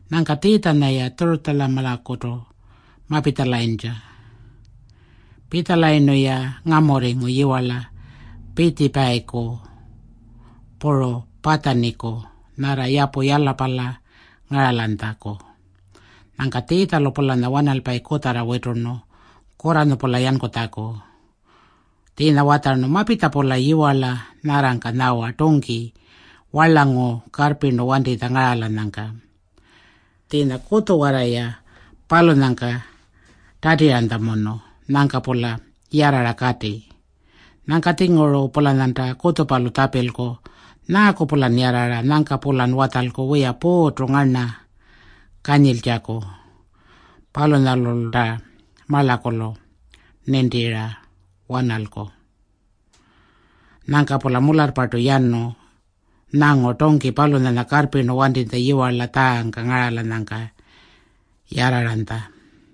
Nyangka Tjiitjanya-ya Tjurutjamalakutu mapitjalayintja. Pitjalayirnu-ya ngamurringu yiwarla Pitjipayiku puru Patjaniku nyarra yapu Yalapala ngaralanytjaku. Nyangka Tjiitjalu-pulanya wanalpayi kutjarra witurnu kurranyu-pula yankutjaku. Tjiinya watjarnu, “Mapitja-pula yiwarla nyarrangka nyawa tungki warlangu karrpirnu wantitja ngaralanyangka. Tjiinya kutjuwarra-ya palunyangka tatiranytjamunu. Nyangka-pula yarrara kati. Nyangka-tjinguru-pulanyanta kutjupalu tjapilku, ‘Nyaaku-pulan yarrara?’ Nyangka-pulan watjalku, ‘Wiya, Puurrtu ngarna kanyiltjaku. Palunyalulta marlakulu nintira wanalku.’” Nyangka-pula mularrpartu yanu nyangu tungki palunyanya karrpirnu wantitja yiwarla tjaangka ngaralanyangka yarraranytja.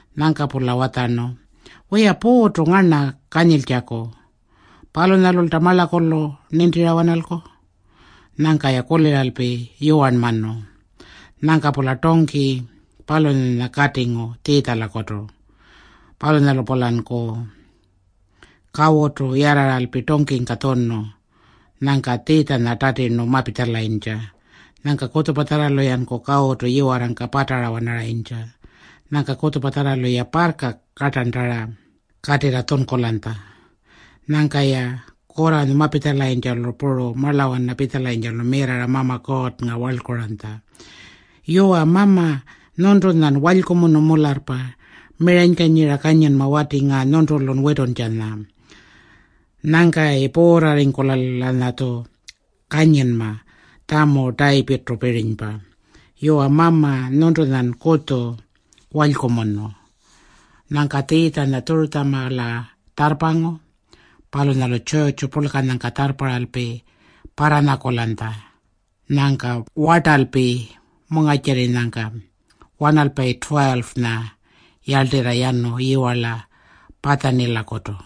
Nyangka-pula watjarnu, “Wiya, Puurrtu ngarna kanyiltjaku. Palunyalulta marlakulu nintira wanalku.” Nyangka-ya kuliralpi yuwarnmanu. Nyangka-pula tungki palunyanya katingu Tjiitjalakutu. Palunyalu-pulanku kawutu yarraralpi tungkingka tjunu. Nyangka Tjiitjanya tatirnu mapitjalayintja. Nyangka kutjupatjarralu-yanku kawutu yiwarrangka patara-wanaranytja. Nyangka kutjupatjarralu-ya parrka kartarntara katirra tjunkulanytja. Nyangka-ya kurranyu mapitjalayintjalu puru marlawana pitjalayintjalu mirrarra Mama Kuurrnga warlkuranytja, “Yuwa Mama, nyuntunyan walykumunu mularrpa. Miranykanyira kanyinma wati ngaa nyuntulun wituntjanya. Nyangkayi puurrarringkula-lanyatju kanyinma tjamu Tayipirrtupirinypa. Yuwa Mama, nyuntunyan kutju walykumunu.” Nyangka Tjiitjanya Tjurutjamala tjarrpangu. Palunyalu tjurrtju purlkanyangka tjarrparralpi parranyakulanytja. Nyangka wartalpi mungarrtjirrinyangka wanalpayi 12-nya yarltirra yanu yiwarla Patjanilakutu.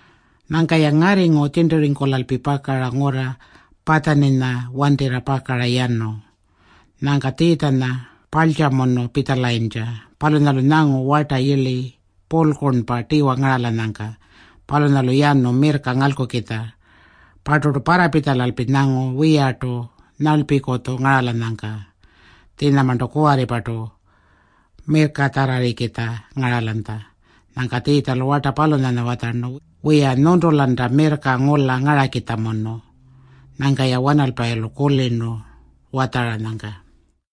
Nyangka-ya ngarringu tjirnturringkulalpi pakara ngurra Patjaninya wantirra yanu. Nyangka Tjiitjanya parltjamunu pitjalayintja. Palunyalu nyangu warta yirli purlkurnpa tiwa ngaralanyangka. Palunyalu yanu mirrka ngalkukitja. Parturtu parrapitjalalpi nyangu wiyartu nyarlpikutju ngaralanyangka. Tjiinyamarntu kuwarripartu mirrkatjarrarrikitja ngaralanytja. Nyangka Tjiitjalu warta palunyanya watjarnu, “Wiya, nyuntulanta mirrka ngula ngarakitjamunu.” Nyangka-ya wanalpayilu kulirnu watjaranyangka.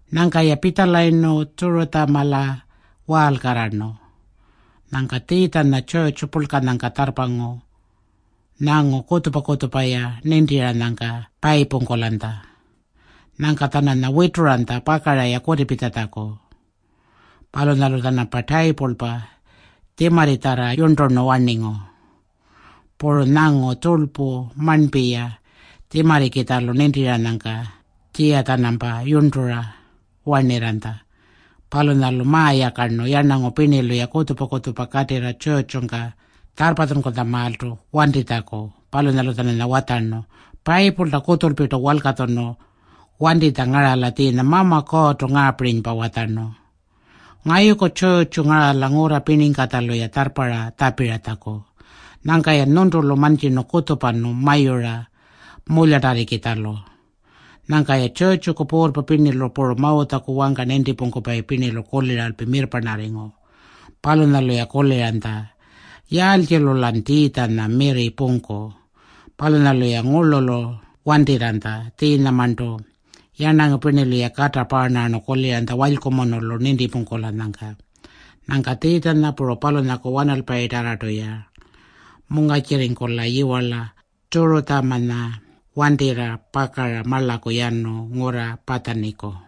Nyangka-ya pitjalayirnu Tjurutjamala waalkarrarnu. Nyangka Tjiitjanya tjurrtju purlkanyangka tjarrpangu nyangu kutjupa-kutjupa-ya nintiranyangka-ya payipungkulanytja. Nyangka-tjananya wituranytja pakara-ya kutipitjatjaku. Palunyalu-tjanampa tayipulpa tjimarritjarra yurnturnu warningu. Puru nyangu tjurlpu marnpi-ya tjimarrikitjalu nintiranyangka tjiya-tjanampa yurntura warnirranytja. Palunyalu mayakarnu yarnangu pirnilu-ya kutjupa-kutjupa katirra tjurrtjungka tjarrpatjunkutjamaaltu wantitjaku. Palunyalu-tjananya watjarnu, “Payipulta kutjulpirtu walkatjunu wantitja ngarala tjiinya Mama Kuurrtu ngaapirinypa watjarnu, ‘Ngayuku tjurrtju ngarala ngurra pirningkatjalu-rniya tjarrparra tjapiratjaku.’ Nyangka-yan nyuntulu mantjirnu kutjupanu mayura mulyatarrikitjalu.” Nyangka-ya tjurrtjuku puurrpa pirnilu puru Mawutjaku wangka nintipungkupayi pirnilu kuliralpi mirrparnarringu. Palunyalu-ya kuliranytja, “Yaaltjilu-lan Tjiitjanya mirri pungku?” Palunyalu-ya ngurlulu wantirranytja. Tjiinyamarntu yarnangu pirnilu-ya kata paarnarrarnu kuliranytja walykumunulu nintipungkulanyangka. Nyangka Tjiitjanya puru palunyaku wanalpayitarrartu-ya mungarrtjirringkula yiwarla Tjurutjamanya wantirra pakara marlaku yanu ngurra Patjaniku.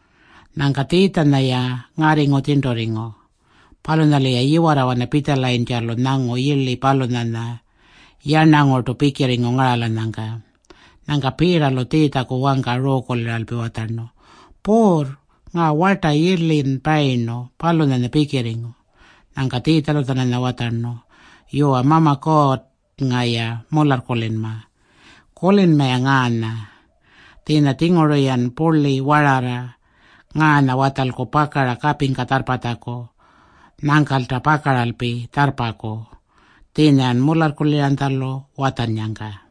Nyangka Tjiitjanya-ya ngarringu tjirnturringu. Palunyalu-ya yiwarrawana pitjalayintjalu nyangu yirli palunyanya yarnangurtu pikirringu ngaralanyangka. Nyangka Piitalu Tjiitjaku wangka ruukuliralpi watjarnu, “Puurr, ngaa warta yirlin payirnu, palunyanya pikirringu.” Nyangka Tjiitjalu-tjananya watjarnu, “Yuwa, Mama Kuurrnga-ya mularrkulinma. Kulinma-ya ngaanya. Tjiinya-tjinguru-yan purli wararra ngaanya watjalku pakara kapingka tjarrpatjaku. Nyangkalta pakaralpi tjarrpaku, tjiinya-yan mularrkuliranytjalu watjannyangka.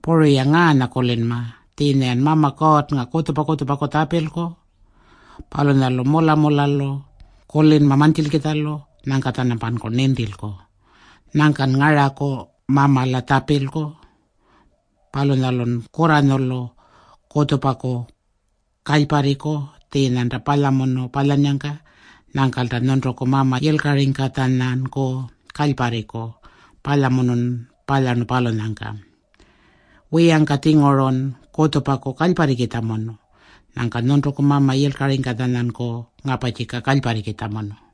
Puru-ya ngaanya kulinma. Tjiinya-yan Mama Kuurrnga kutjupa-kutjupaku tjapilku. Palunyalu mula-mulalu kulinma mantjilkitjalu. Nyangka-tjanampanku nintilku. Nyangkan ngaraku Mamala tjapilku. Palunyalun kurranyulu kutjupaku kalyparriku tjiinyanta palyamunu palyannyangka. Nyangkalta nyuntuku Mama yilkaringkatjanyanku kalyparriku palyamunun palyarnu palunyangka. [Wiyangka-tjingurun kutjupaku kalyparrikitjamunu. Nyangka nyuntuku Mama yilkaringkatjanyanku ngaparrtjika kalyparrikitjamunu.”]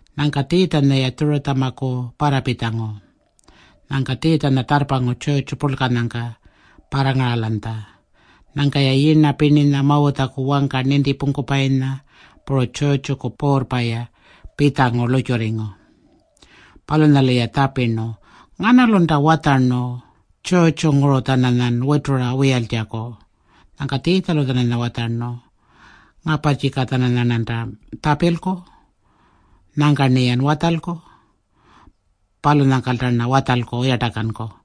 Nyangka Tjiitjanya-ya Tjurutjamaku parrapitjangu. Nyangka Tjiitjanya tjarrpangu tjurrtju purlkanyangka parrangaralanytja. Nyangka-ya yirna pirninya, Mawutjaku wangka nintipungkupayinya, puru tjurrtjuku puurrpa-ya pitjangu lurrtjurringu. Palunyalu-ya tjapirnu, “Nganalunta watjarnu tjurrtjunguru-tjananyan witura wiyaltjaku?” Nyangka Tjiitjalu-tjananya watjarnu, “Ngaparrtjika-tjananyarnanta tjapilku. Nyangka-rniyan watjalku. Palunyangkalta-rna watjalku yartakanku.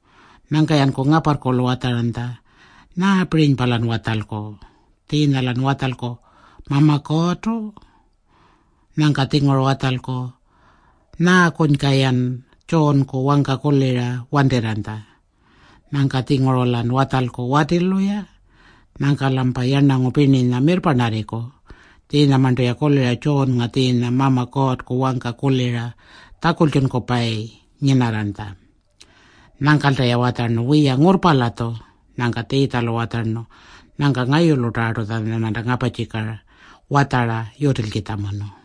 Nyangka-yanku ngaparrkulu watjaranytja, “Nyaapirinypa-lan watjalku? Tjiinya-lan watjalku, ‘Mama Kuurrtu.’ Nyangka-tjinguru watjalku, ‘Nyaakunyka-yan Tjuunku wangka kulira wantirranytja?’ Nyangka-tjinguru-lan watjalku, ‘Watilu-ya.’ Nyangka-lampa yarnangu pirninya mirrparnarringku. Tjiinyamarntu-ya kulira Tjuunnga tjiinya Mama Kuurrku wangka kulira tjakultjunkupayi nyinarranytja.” Nyangkalta-ya watjarnu, “Wiya, ngurrpa-latju.” Nyangka Tjiitjalu watjarnu, “Nyangka ngayulutarrartu-tjananyarnanta ngaparrtjika watjara yutilkitjamunu.”